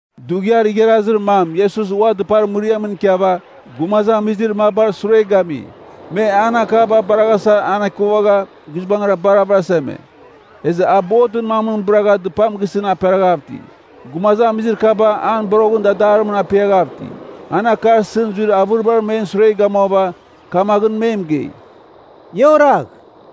Dughiar igharazir mam Iesus ua dɨpar mɨriamɨn ikiava, gumazamizir mabar sure gami. Me an akaba baraghasa anekuvagha guizbangɨra bar avɨraseme. Ezɨ a botɨn mamɨn bɨragha dɨpam gisɨn aperaghav iti. Gumazamizir kaba an boroghɨn dadarimɨn apiaghav iti. An akar isɨn zuir avɨribar men sure gamuava, kamaghɨn me mɨgei, “Ia oragh.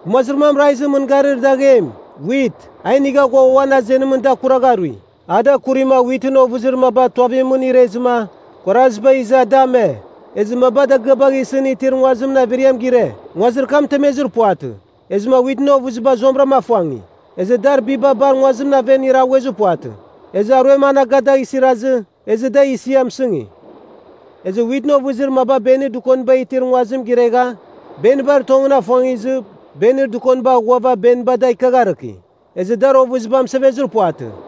Gumazir mam raizɨn mɨngarir daghem, wit, a inigha ghua uan azenimɨn da akuragharui. A da akurima witɨn ovɨzir maba tuavimɨn irezɨma, kuaraziba iza da ame. Ezɨ maba dagɨabagh isɨn itir nguazir evarim gire. Nguazir kam mɨtemezir puvatɨ, ezɨma witɨn ovɨziba zuamɨra afuangi. Ezɨ dar biba bar nguazimɨn aven iraghuezir puvatɨ, ezɨ aruem anaga dagh isirazɨ, ezɨ da isia mɨsɨngi. Ezɨ witɨn ovɨzir maba benir dɨkoniba itir nguazim giregha, benibar tongɨn afuangizɨ, benir dɨkoniba aghuava beniba da ikiagharɨki. Ezɨ dar ovɨziba mɨsevezir puvatɨ.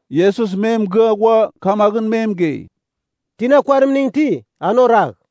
Iesus me mɨgɨa ghua kamaghɨn me mɨgei, “Tina kuarimning iti, an oragh.”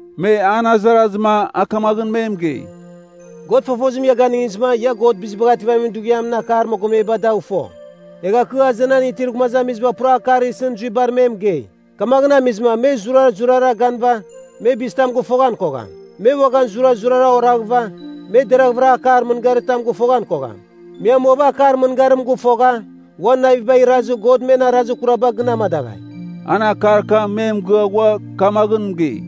Me an azarazɨma a kamaghɨn me mɨgei, “God fofozim ia ganɨngizɨma, ia God Bizibagh Ativamin Dughiamɨn akar mogomeba dagh fo. Egha kɨ azenan itir gumazamiziba pura akar isɨn zuibar me mɨgei. Kamaghɨn amizɨma ‘Me zurazurara ganɨva, me bizitam gɨfoghan kogham. Me uaghan zurazurara oraghɨva, me deraghvɨra akar mɨngaritam gɨfoghan kogham. Me amuava akar mɨngarim gɨfogha, uan navibagh irazɨ, God men arazir kuraba gɨn amadaghai.’” An akar kam me mɨgɨa ghua kamaghɨn mɨgei,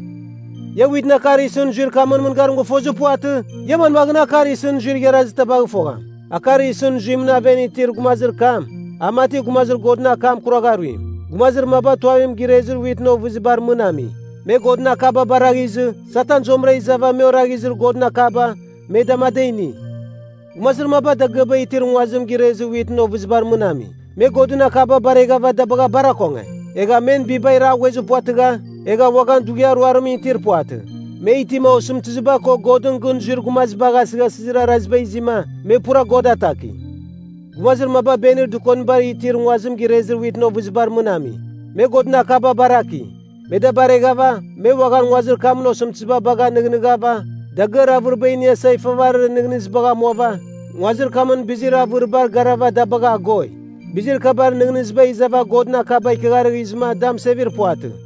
“Ia witɨn akar isɨn zuir kamɨn mɨngarim gɨfozir puvatɨ? Ia manmaghɨn akar isɨn zuir igharazir tabagh fogham? Akar isɨn zuimɨn aven itir gumazir kam a mati gumazir Godɨn akam kuragharuim Gumazir maba tuavim girezir witɨn ovɨzibar mɨn ami. Me Godɨn akaba baraghizɨ Satan zuamɨra izava me oraghizir Godɨn akaba, me dama ada ini. Gumazir maba dagɨaba itir nguazim girezir witɨn ovɨzibar mɨn ami. Me Godɨn akaba bareghava da bagha bar akonge. Egha men biba iraghuezir puvatɨgha, egha uaghan dughiar ruarimɨn itir puvatɨ. Me itima osɨmtɨziba ko Godɨn gɨn zuir gumazibagh asɨghasɨzir araziba izima, me pura God ataki. Gumazir maba benir dɨkoniba itir nguazim girezir witɨn ovɨzibar mɨn ami. Me Godɨn akaba baraki. Me da bareghava me uaghan nguazir kamɨn osɨmtɨziba bagha nɨghnɨghava, dagɨar avɨriba iniasa ifavarir nɨghnɨzibagh amuava, nguazir kamɨn bizir avɨribar garava da bagha agoi. Bizir kabar nɨghnɨziba izava Godɨn akaba ikiagharɨzɨma da mɨsevir puvatɨ.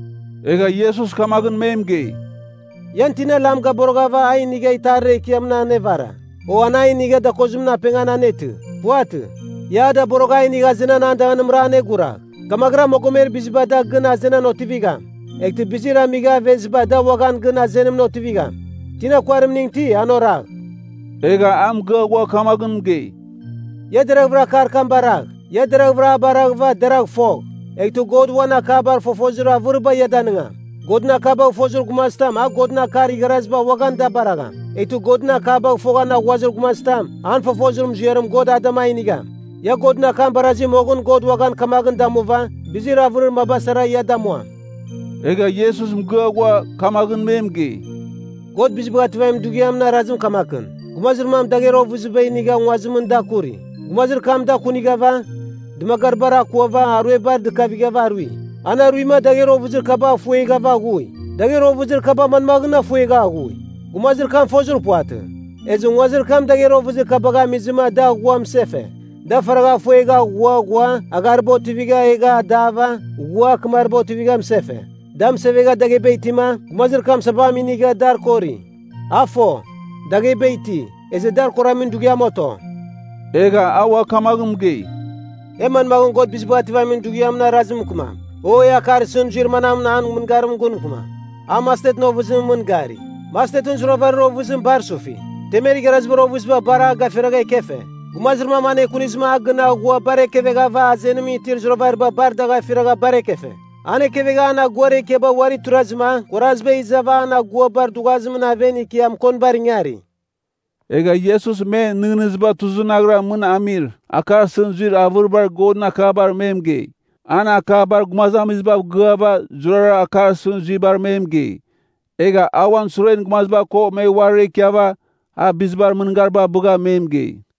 Egha Iesus kamaghɨn me mɨgei, “Ian tina lam gaboroghava a inigha itarir ekiamɨn anevara? O an a inigha dakozimɨn apengan anetɨ? Puvatɨ! Ia a daborogh a inigh azenan an danganimra aneguragh. Kamaghɨra mogomer biziba da gɨn azenan otivigham. Eghtɨ bizir amigha aveziba da uaghan gɨn azenan otivigham. Tina kuarimning iti, an oragh.” Egha a mɨgɨa ghua kamaghɨn mɨgei, “Ia deraghvɨra akar kam baragh. Ia deraghvɨra a baraghɨva deragh fogh, eghtɨ God uan akabar fofozir avɨriba ia danɨngam. Godɨn akabagh fozir gumazitam a Godɨn akar igharaziba uaghan da baragham. Eghtɨ Godɨn akabagh foghan aghuazir gumazitam, an fofozir muziarim God a dama inigham. Ia Godɨn akam barazi moghɨn God uaghan kamaghɨn damuva, bizir avɨrir maba sara ia damuam.” Egha Iesus mɨgɨa ghua kamaghɨn me mɨgei, “God Bizibagh Ativamin Dughiamɨn arazim kamakɨn. Gumazir mam dagher ovɨziba inigha nguazimɨn da kuri. Gumazir kam da kunighava, dɨmagaribar akuava, aruebar dɨkavigha arui. An aruima dagher ovɨzir kaba da afuegha aghui. Dagher ovɨzir kaba manmaghɨn afuegha aghui? Gumazir kam fozir puvatɨ. Ezɨ nguazimra dagher ovɨzir kabagh amizɨma da aghua mɨsefe. Da faragha afuegha aghua ghua aghariba otivigha egha adava ghua akɨmariba otivigha mɨsefe. Da mɨsevegha dagheba itima, gumazir kam sabam inighava dar akori. A fo, dagheba iti, ezɨ dar akoramin dughiam oto.” Egha a ua kamaghɨn mɨgei, “E manmaghɨn God Bizibagh Ativamin Dughiamɨn arazim mɨkɨmam? O, e akar isɨn zuir manamɨn an mɨngarimɨn gun mɨkɨmam? A mastetɨn ovɨzimɨn mɨn gari. Mastetɨn zuravarir ovɨziba bar sufi. Temer igharazibar ovɨziba bar a gafiragha ekefe. Gumazir mam anekunizɨma a gɨn aghua bar ekeveghava azenimɨn itir zuravariba bar dagh afiragha bar ekefe. An ekevegha an aguar ekiaba uari tuirazɨma kuaraziba izava an aguabar dughuazimɨn aven ikia mɨkonibar ingari.” Egha Iesus men nɨghnɨziba tuzɨnaghara mɨn amir akar isɨn zuir avɨribar Godɨn akabar me mɨgei. An akabar gumazamizibav gɨava zurara akar isɨn zuibar me mɨgei. Egha a uan suren gumaziba ko me uarira ikiava a bizibar mɨngariba abɨgha me mɨgei.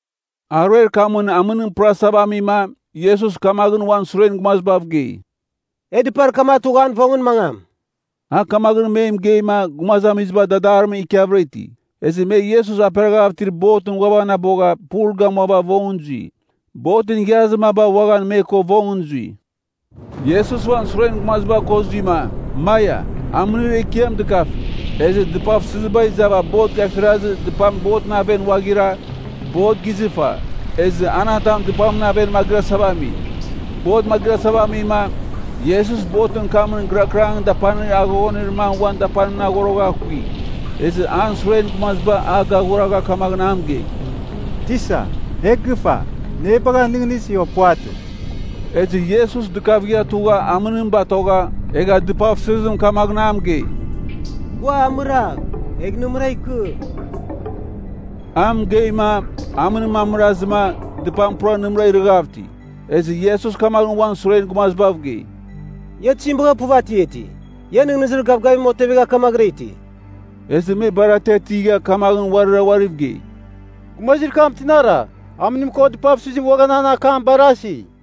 Aruer kamɨn amɨnim pɨrasava amima Iesus kamaghɨn uan suren gumazibav gei, “E dɨpar kam atugh an vongɨn mangam.” A kamaghɨn me mɨgeima gumazamiziba dadarimɨn ikiavɨra iti. Ezɨ me Iesus aperaghav itir botɨn ghuavanabogha pul gamua vongɨn zui. Botɨn igharazir maba uaghan me ko vongɨn zui. Iesus uan suren gumaziba ko zuima, Maia! Amɨnir ekiam dɨkafi. Ezɨ dɨpavsɨziba izava bot gafirazɨ dɨpam botɨn aven ghuaghira, bot gizɨfa, ezɨ an atam dɨpamɨn aven magɨrasava ami. Bot magɨrasava amima, Iesus botɨn kamɨn gɨrakɨrangɨn dapanir aghoghonir mam uan dapanimɨn aghorogha akui. Ezɨ an suren gumaziba a gaghuragha kamaghɨn a mɨgei, “Tisa, e gɨfa! Nɨ e bagha nɨghnɨsi, o puvatɨ?” Ezɨ Iesus dɨkavigha tugha amɨnim batogha, egha dɨpavsɨzim kamaghɨn a mɨgei, “Gua amɨragh, egh nɨmɨra ikɨ!” A mɨgeima, amɨnim amɨrazɨma, dɨpam pura nɨmɨra irɨghav iti. Ezɨ Iesus kamaghɨn uan suren gumazibav gei, “Ia tizim bagha puv atiati? Ia nɨghnɨzir gavgavim otevegha kamaghɨra iti?” Ezɨ me bar atiatigha kamaghɨn uarira uariv gei, “Gumazir kam tinara? Amɨnim ko dɨpavsɨzim uaghan an akam barasi!”